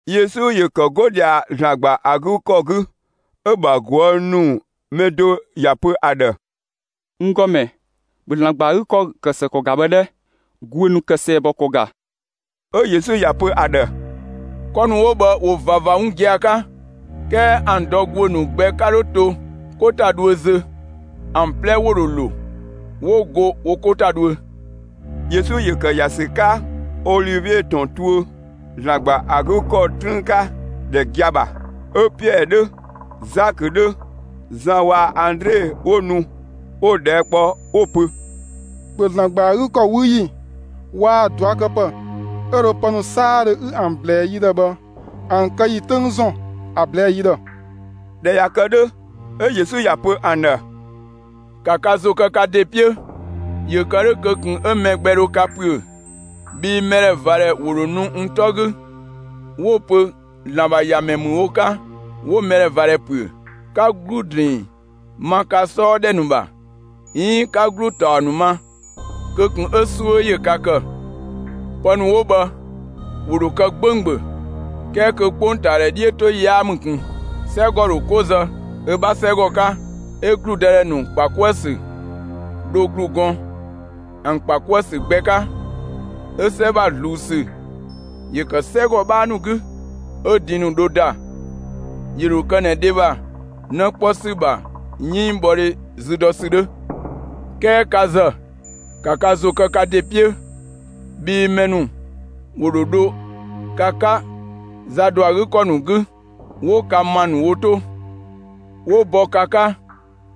Yesu ‑yö ‑kë 'go ꞊dhia ‑Zlan ‑gba ‑a 'gü ‑kɔ 'gü, 'ö‑ ‑bha ꞊guë' ‑nu mɛ do ‑ya pö ‑a ‑dhë: «N ‑Gɔmɛ, ‑bhö ‑Zlan ‑gba ‑a 'gü ‑kɔ kë ‑së ‑kɔ ‑ga bhë 'dhɛ! ‑Guö ‑nu kë ‑sɛɛbɔ ‑kɔ ‑ga!» 'Ö Yesu ‑ya pö ‑a ‑dhë: «'Kɔ ‑nu 'wo bhë ‑wo ꞊vava 'wun gia‑ 'ka, 'kɛɛ ‑an dɔ ‑guö ‑nu gbɛ 'ka 'dho to 'ko ‑ta dhuö zö, ‑an 'plɛ ‑wo ‑dho ‑lo, 'wo go wo 'ko ‑ta dhuö.» Yesu ‑yö ‑kë ‑ya ‑sü 'ka Olivie ‑tɔn tuö, ‑Zlan ‑gba ‑a 'gü ‑kɔ 'trüün 'ka, ‑dhɛ gia‑ ‑bha. 'Ö Piɛɛ 'dhö, Zakö 'dhö, Zan waa‑ Andre 'wo nu, 'wo‑ ꞊dhɛɛ' kpɔ 'wo‑ pö: «‑Bhö ‑Zlan ‑gba ‑a 'gü ‑kɔ 'wü ‑yi waa‑ ꞊duakëpë 'ö dho pë ‑nu 'saadhö 'ü ‑an ꞊blɛɛ yi ‑dhë bhë, ‑an kë ‑yi 'töng ‑zɔn, ‑a ꞊blɛɛ'‑ yi ‑dhë!» ꞊Dhɛ ꞊ya kë 'dhö, 'ö Yesu ‑ya pö ‑an ‑dhë: «‑Ka ka ‑zo kë ka ‑de 'piö, ‑yö kë 'dhö, kö ꞊kun 'ö mɛ gbɛ dho ka ‑püö! Bhii mɛdhɛvadhɛ ‑wo ‑dho nu n 'tɔ 'gü 'wo‑ pö ‑Zlan ‑bha ‑Yamɛ ‑mü wo 'ka; 'wo mɛdhɛvadhɛ ‑püö. 'Ka ‑glu ‑drinng ma ka 'sɔɔ ‑dhɛ ‑nu ‑bha, 'iin 'ka ‑glu ‑taɔ ‑nu ma, kö ꞊kun 'ö 'suö ‑yö ka ‑kë! Pë ‑nu 'wo bhë, ‑wo ‑dho kë 'gbɛɛdhö; 'kɛɛ kö 'kpongtaa 'dhiötoyi yaa ‑mü ꞊kun. 'Sɛgɔ ‑dho 'ko zë ö 'bha 'sɛgɔ 'ka, 'ö ‑gludëdhɛ ‑nu ‑kpa 'kuë‑ ‑sü dho ‑glu gɔn ‑an ‑kpa 'kuë‑ ‑sü gbɛ 'ka. 'Ö 'sɛ ‑bha ꞊zluun ‑sü ‑yö ‑kë 'sɛgɔ 'bhaa ‑nu 'gü; 'ö din ‑nu dho ‑da. ‑Yö ‑dho kë ꞊nɛ dhe ‑bha 'në 'kpɔ ‑sü ‑bha 'yënngbhɔdhe zü dɔ ‑sü 'dhö. 'Kɛɛ ka ‑zë, ‑ka ka ‑zo kë ka ‑de 'piö! Bhii mɛ ‑nu ‑wo ‑dho dho ka 'ka za ‑dɔ ‑a 'gü ‑kɔ ‑nu 'gü, 'wo ka ‑ma ‑nu wo 'to. ‑Wo bɔ ka 'ka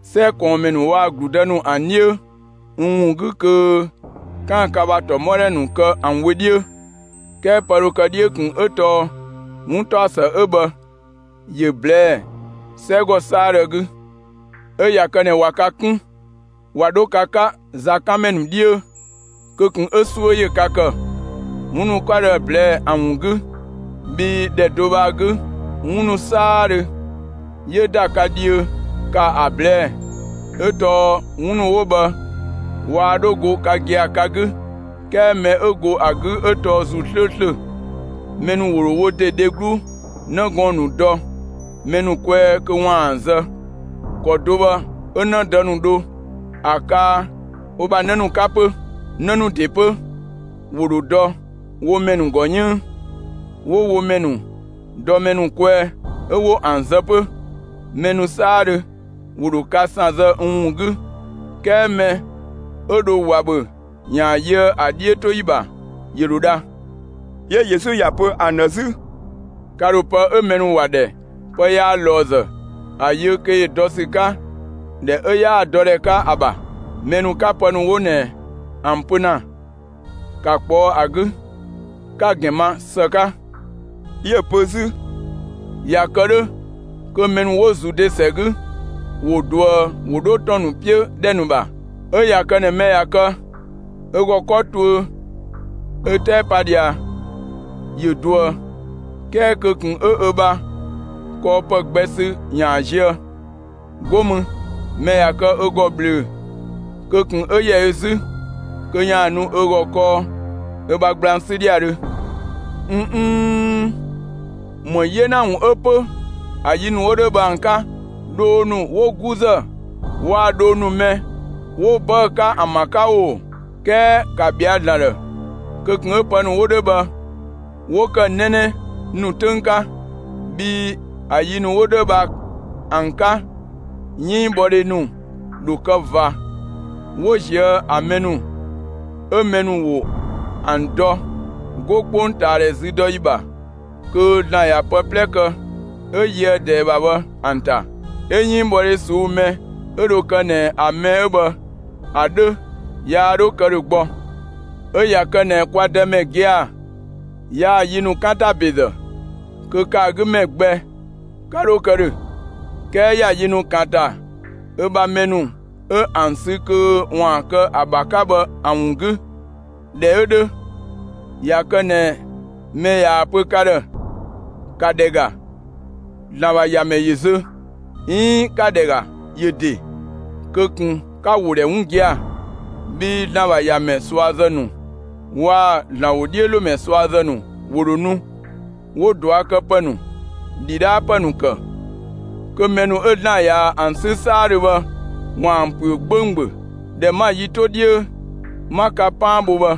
'sɛ ꞊kɔɔnmɛ ‑nu waa‑ ‑gludë ‑nu ‑an 'dhiö n ‑wun 'gü kö 'kaan‑ ka ‑bha ‑tɔmɔdhɛ ‑nu kë ‑an wö 'dhiö. 'Kɛɛ pë dho kë 'dhiö ꞊kun 'ö tɔɔ 'wuntaɔsë 'ö bhë ‑yö ꞊blɛɛ'‑ 'sɛgɔ 'saadhö 'gü. 'Ö ꞊ya kë ꞊nɛ ꞊wa ka 'kun, ꞊wa 'dho ka 'ka zakanmɛ ‑nu 'dhiö, kö ꞊kun 'ö 'suö ‑yö ka ‑kë, 'wun ‑nu 'ö 'ka dho ‑a ꞊blɛɛ'‑ ‑an ‑wun 'gü, bhii ‑dhɛ do bhë ‑a 'gü, 'wun ‑nu 'saadhö 'yö ‑da ka dhiö, ‑ka ‑a ꞊blɛɛ'‑; 'ö tɔɔ 'wun ‑nu 'wo bhë waa 'dho go ka gia‑ ka 'gü, 'kɛɛ mɛ 'ö go ‑a 'gü 'ö tɔɔ ‑Zuu 'slööslö. Mɛ ‑nu ‑wo ‑dho wo ‑de dheglu 'në gɔɔn‑ ‑nu dɔ mɛ ‑nu kwɛɛ kö ‑waan ‑an zë. ‑Kɔ do bhë, 'ö 'në dë ‑nu dho ‑a kaa wo ‑bha 'në ‑nu 'ka 'pö. 'Në ‑nu ‑de 'pö, ‑wo ‑dho dɔ wo mɛ ‑nu ‑gɔ 'yënng, 'wo wo mɛ ‑nu dɔ mɛ ‑nu kwɛɛ, 'ö 'wo ‑an zë 'pö. Mɛ ‑nu 'saadhö ‑wo ‑dho ka ‑san zë n ‑wun 'gü, 'kɛɛ mɛ 'ö dho ꞊wa ‑bhö ‑yaan yöë ‑a 'dhiötoyi ‑bha, ‑yö ‑dho dha.» 'Yö Yesu ‑ya pö ‑an ‑dhë 'zü: «Ka ‑dho pë 'ö mɛ ‑nu ‑wa ‑dhɛ ‹pë yaa ꞊lɔɔzë› ‑a yö kö ‑yö dɔ ‑sü 'ka ‑dhɛ 'ö 'yaa‑ dɔ ‑dhɛ 'ka ‑a ‑bha. Mɛ ‑nu 'ka pë ‑nu 'wo ꞊nɛ ‑an pö ‑na, ‑ka ꞊kpɔɔ' ‑a 'gü, 'ka‑ ‑gɛn ma ‑së 'ka.» 'Yö‑ pö 'zü: «꞊Ya kë 'dhö, kö mɛ ‑nu 'wo Zude ‑sɛ 'gü ‑wo ꞊duë 'wo dho ‑tɔn ‑nu 'piö ‑dhɛ ‑nu ‑bha. 'Ö ꞊ya kë ꞊nɛ mɛ ꞊ya kë ö ‑gɔ 'kɔ tuö ö 'tɛɛ pa ꞊dhia, ‑yö ꞊duë; 'kɛɛ kö ꞊kun 'ö ö bha kɔɔpë gbɛ sü ‑yaan zië. 'Go mü, mɛ ꞊ya kë ö ‑gɔ ꞊bhlöö‑, kö ꞊kun 'ö ‑yɛ ö 'zü kö ‑yaan nu ö ‑gɔ kɔɔ ö bha gblang 'sü ‑dhiadhö. ꞊N nnn! ‑Më 'yena ‑wun 'ö 'pö ‑a yi ‑nu 'wo 'dhö bhë ‑an 'ka, dhoo ‑nu 'wo 'guzë waa‑ dhoo ‑nu mɛ 'wo 'bëë‑ 'ka ‑an ‑bha 'ka oo! 'Kɛɛ ‑ka ‑bhɛa ‑Zlan ‑dhë, kö ꞊kun 'ö pë ‑nu 'wo 'dhö bhë 'wo ‑kë 'nɛnɛ nu 'töng 'ka! Bhii ‑a yi ‑nu 'wo 'dhö bhë ‑an 'ka 'yënngbhɔdhe ‑nu ‑dho kë ꞊va, 'wo ꞊zië' ‑an mɛ ‑nu 'ö mɛ ‑nu ‑wo ‑an dɔ, 'go 'kpongtaadhɛ züdɔyi ‑bha kö ‑Zlan ꞊ya pë 'plɛ kë, 'ö yöë ꞊dɛɛ ‑bha bhë ‑an ‑ta. 'Ö 'yënngbhɔdhe ꞊suu'‑ mɛ 'ö dho kë ꞊nɛ ‑a mɛ 'ö bhë ‑a 'dhö yaa 'dhö kë ‑dhö gbɔ. 'Ö ꞊ya kë ꞊nɛ kwa Dëmɛ gia‑ yaa‑ yi ‑nu 'kan ‑ta ‑bezë, kö ‑kë ‑a 'gü ‑mɛ gbɛ 'ka 'dho kë ‑dhö. 'Kɛɛ ‑ya yi ‑nu ‑kan ‑ta ö bha mɛ ‑nu 'ö ‑an sü kö ‑waan kë ö ‑bha 'ka bhë ‑an ‑wun 'gü. ꞊Dhɛ 'ö 'dhö, ꞊ya kë ꞊nɛ mɛ ꞊yaa‑ pö ka ‑dhë: ‹‑Ka ‑dhɛ ‑ga, ‑Zlan ‑bha ‑Yamɛ ‑yö zö› 'iin ‹‑ka ‑dhɛ ‑ga, ‑yö ‑de›, kö ꞊kun 'ka‑ ‑wo ‑dhɛ 'wun gia‑! Bhii ‑Zlan ‑bha ‑Yamɛ ꞊suazë ‑nu waa‑ ‑Zlan ‑wodhiölomɛ ꞊suazë ‑nu ‑wo ‑dho nu, 'wo ꞊duakëpë ‑nu, ‑dhidhaapë ‑nu ‑kë, kö mɛ ‑nu 'ö ‑Zlan ꞊yaa‑ ‑an 'sü 'saadhö bhë ‑waan ‑püö 'gbɛɛdhö. ꞊Dhɛ 'ma‑ yi ‑nu 'to 'dhiö, 'ma ka 'paan bho bhë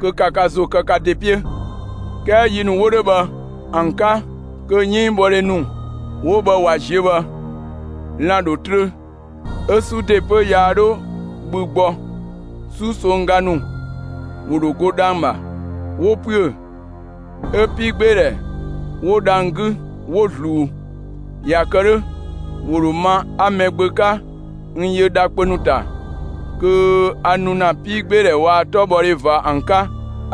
kö ‑ka ka ‑zo kë ka ‑de 'piö!» 'Kɛɛ yi ‑nu 'wo 'dhö bhë ‑an 'ka kö 'yënngbhɔdhe ‑nu 'wo bhë ꞊wa ziö bhë, lan‑ ‑dho trö, 'ö 'su ‑de 'pö yaa 'dho bhü gbɔ. 'Susongga ‑nu ‑wo ‑dho go dhang‑ ‑bha, 'wo ‑püö, 'ö 'piigbeedhɛ 'wo dhang‑ 'gü, 'wo ꞊zluun. ꞊Ya kë 'dhö, ‑wo ‑dho ma 'a Mɛgbö 'ka, n yö dha kpö ‑nu ‑ta kö a nu ‑na 'piigbeedhɛ waa‑ 'tɔbhɔdhe ꞊va ‑an 'ka.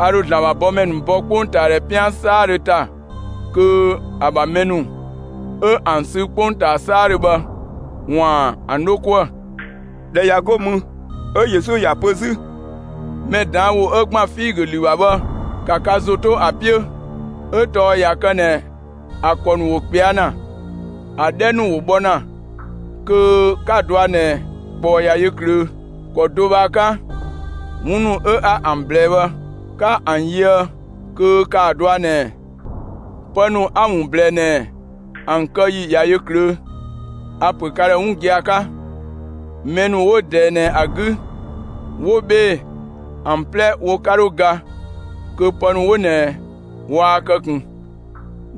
A ‑dho ‑Zlan ‑bha bɔmɛ ‑nu bɔ 'kpongtaadhɛ 'pian 'saadhö ‑ta kö ‑a ‑bha mɛ ‑nu 'ö ‑an sü 'kpongtaa 'saadhö bhë ‑waan ‑an 'dho 'kuë‑. ꞊Dhɛ ꞊ya 'go mü, 'ö Yesu ‑ya pö 'zü: «Mɛ ꞊daan' ‑wo 'ö ‑gban figö ‑lü ‑bha bhë ‑ka ka ‑zo 'to ‑a 'piö! 'Ö tɔɔ ꞊ya kë ꞊nɛ ‑a ‑kɔ ‑nu ‑wo ꞊kpɛa' ‑na, ‑a 'dhɛ ‑nu ‑wo bhɔ ‑na kö 'ka‑ ꞊dɔa' ꞊nɛ ꞊kpɔɔ ꞊ya yö ꞊klöö'. ‑Kɔ do bhë ‑a 'ka 'wun ‑nu 'ö 'a ‑an ꞊blɛɛ bhë, 'ka ‑an yöë, kö ‑kaa dɔa ꞊nɛ, pë ‑nu 'a‑ ‑wun ꞊blɛɛ ꞊nɛ, ‑an kë ‑yi ꞊ya yö ꞊klöö'. A‑ ‑pö ka ‑dhë 'wun gia‑ 'ka: Mɛ ‑nu 'wo ꞊dɛɛ ꞊nɛ ‑a 'gü 'wo 'bhee‑, ‑an 'plɛ wo 'ka 'dho ga kö pë ‑nu 'wo ꞊nɛ waa kë ꞊kun.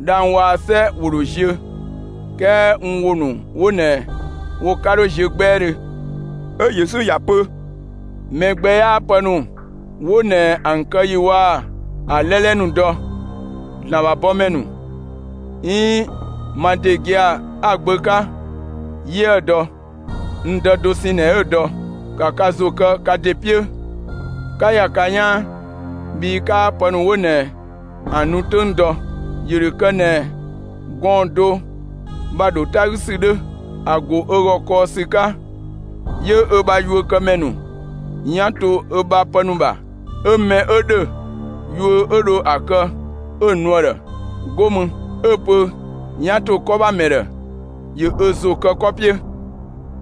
Dhang‑ waa‑ 'sɛ ‑wo ‑dho ziö, 'kɛɛ n ‑wo ‑nu 'wo ꞊nɛ wo 'ka 'dho ziö 'gbɛɛdhö.» 'Ö Yesu ‑ya pö: «Mɛ gbɛ 'yaa pë ‑nu 'wo ꞊nɛ ‑an kë ‑yi waa‑ ‑a 'lɛlɛ ‑nu dɔ; ‑Zlan ‑bha bɔmɛ ‑nu, 'iin ma ‑de gia‑ 'a‑ Gbö 'ka yiëë‑ dɔ. N Dë dosɛn ꞊nɛ 'ö‑ dɔ. ‑Ka ka ‑zo kë ka ‑de 'piö, 'ka ‑ya ka 'yaan, bhii 'kaa pë ‑nu 'wo ꞊nɛ ‑an nu 'töng dɔ. ‑Yö ‑dho kë ꞊nɛ gɔɔn‑ do ‑bha ‑dho 'ta 'gü ‑sü 'dhö: ‑A ‑go ö ‑gɔ kɔɔ ‑sü 'ka, 'yö ö bha yuökëmɛ ‑nu 'yan to ö bha pë ‑nu ‑bha; 'ö mɛ 'ö ‑dhö, yuö 'ö dho ‑a kë, 'ö‑ nu ‑a ‑dhë. 'Go mü, 'ö‑ pö 'yan ‑to 'kɔ ‑bha ‑mɛ ‑dhë ‑yö ö ‑zo kë 'kɔ 'piö.»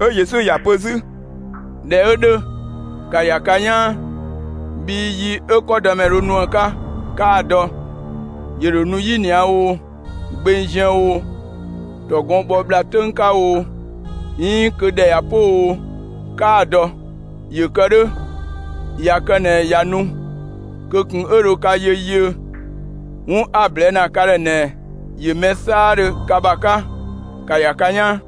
'Ö Yesu ‑ya pö 'zü: «꞊Dhɛ 'ö 'dhö, ‑ka ‑ya ka 'yaan, bhii yi 'ö 'kɔdëmɛ dho nu ‑a 'ka, 'kaa‑ dɔ. ‑Yö ‑dho nu 'yinia oo, gbeng ziën oo, ‑tɔgɔn bhɔ ‑bhla 'töng 'ka oo, 'iin kö ‑dhɛ ꞊ya 'po oo, 'kaa‑ dɔ. ‑Yö kë 'dhö, ꞊ya kë ꞊nɛ ꞊ya nu kö ꞊kun 'yö dho ka yö yiö. 'Wun 'a‑ ꞊blɛɛ' ‑na ka ‑dhë ꞊nɛ ‑yö mɛ 'saadhö ka ‑bha 'ka: 'Ka ‑ya ka 'yaan!»